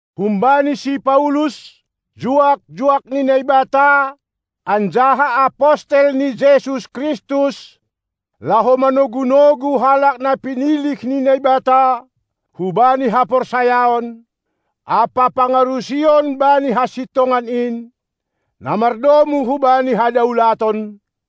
Humbani si Paulus, juak-juak ni Naibata anjaha apostel ni Jesus Kristus, laho manogu-nogu halak na pinilih ni Naibata hubani haporsayaon ampa pangarusion bani hasintongan in, na mardomu hubani hadaulaton,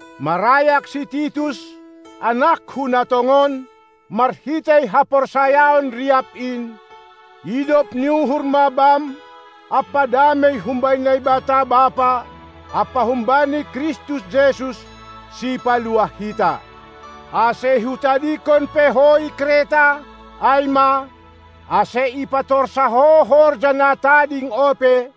marayak si Titus, anakku na tongon, marhitei haporsayaon riap in: Idop ni uhur ma bam ampa damei humbani Naibata Bapa ampa humbani Kristus Jesus, Sipaluah hita. Ase hutadingkon pe ho i Kreta, ai ma, ase ipatorsa ho horja na tading ope,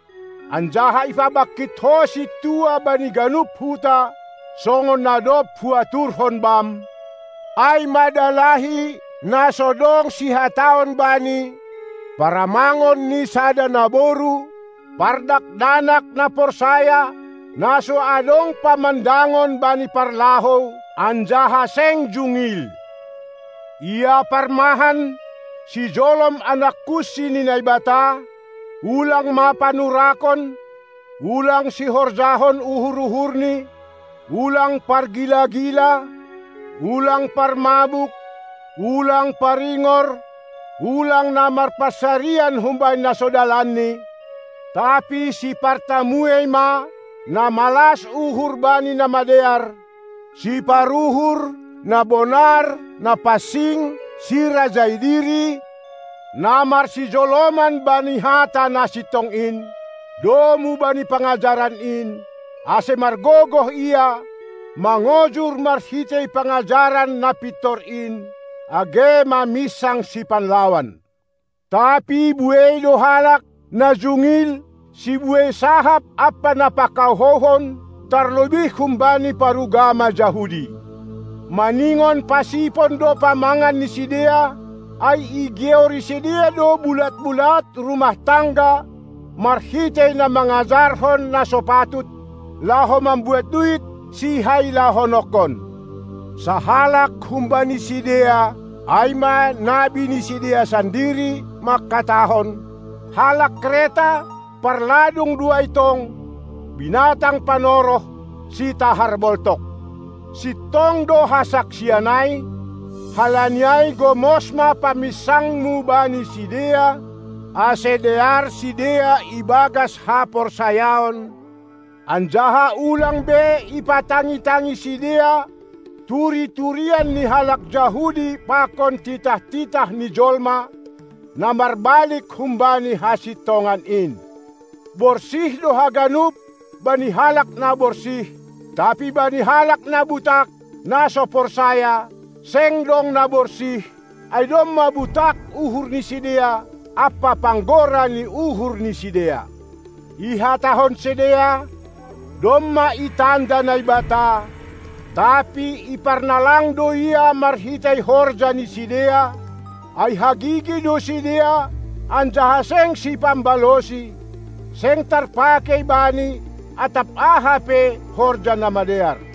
anjaha ipabangkit ho sintua bani ganup huta, songon na dob huaturhon bam, ai ma dalahi na so dong sihataon bani, paramangon ni sada naboru, pardakdanak na porsaya, na so adong pamandangon bani parlahou anjaha seng jungil. Ia parmahan, sijolom anak kunsi ni Naibata, ulang ma panurakon; ulang sihorjahon uhur-uhurni, ulang pargila-gila, ulang parmabuk, ulang paringor, ulang na marpansarian humbani na so dalanni, tapi sipartamuei ma, na malas uhur bani na madear, siparuhur, na bonar, na pansing, sirajai diri, na marsijoloman bani hata na sintong in, domu bani pangajaran in, ase margogoh ia, mangojur marhitei pangajaran na pintor in, age maminsang sipanlawan. Tapi buei do halak, na jungil, sibuei sahap ampa na pakahouhon, tarlobih humbani parugama Jahudi. Maningon pasipon do pamangan ni sidea, ai igeori sidea do bulat-bulat rumah tangga marhitei na mangajarhon na so patut, laho mambuat duit sihailahononkon. Sahalak humbani sidea, ai ma nabi ni sidea sandiri, mangkatahon: Halak Kreta, parladung do ai tong, binatang panoroh, sitahar boltok. Sintong do hasaksian ai; halani ai gomos ma paminsangmu bani sidea, ase dear sidea ibagas haporsayaon, anjaha ulang be ipatangi-tangi sidea turi-turian ni halak Jahudi pakon titah-titah ni jolma, na marbalik humbani hasintongan in. Borsih do haganup bani halak na borsih; tapi bani halak na butak, na so porsaya, seng dong na borsih, ai domma butak uhur ni sidea ampa panggora ni uhur ni sidea. Ihatahon sidea, domma itanda Naibata, tapi iparnalang do Ia marhitei horja ni sidea; ai hagigi do sidea anjaha seng sipambalosi, seng tarpakei bani atap aha pe horja na madear.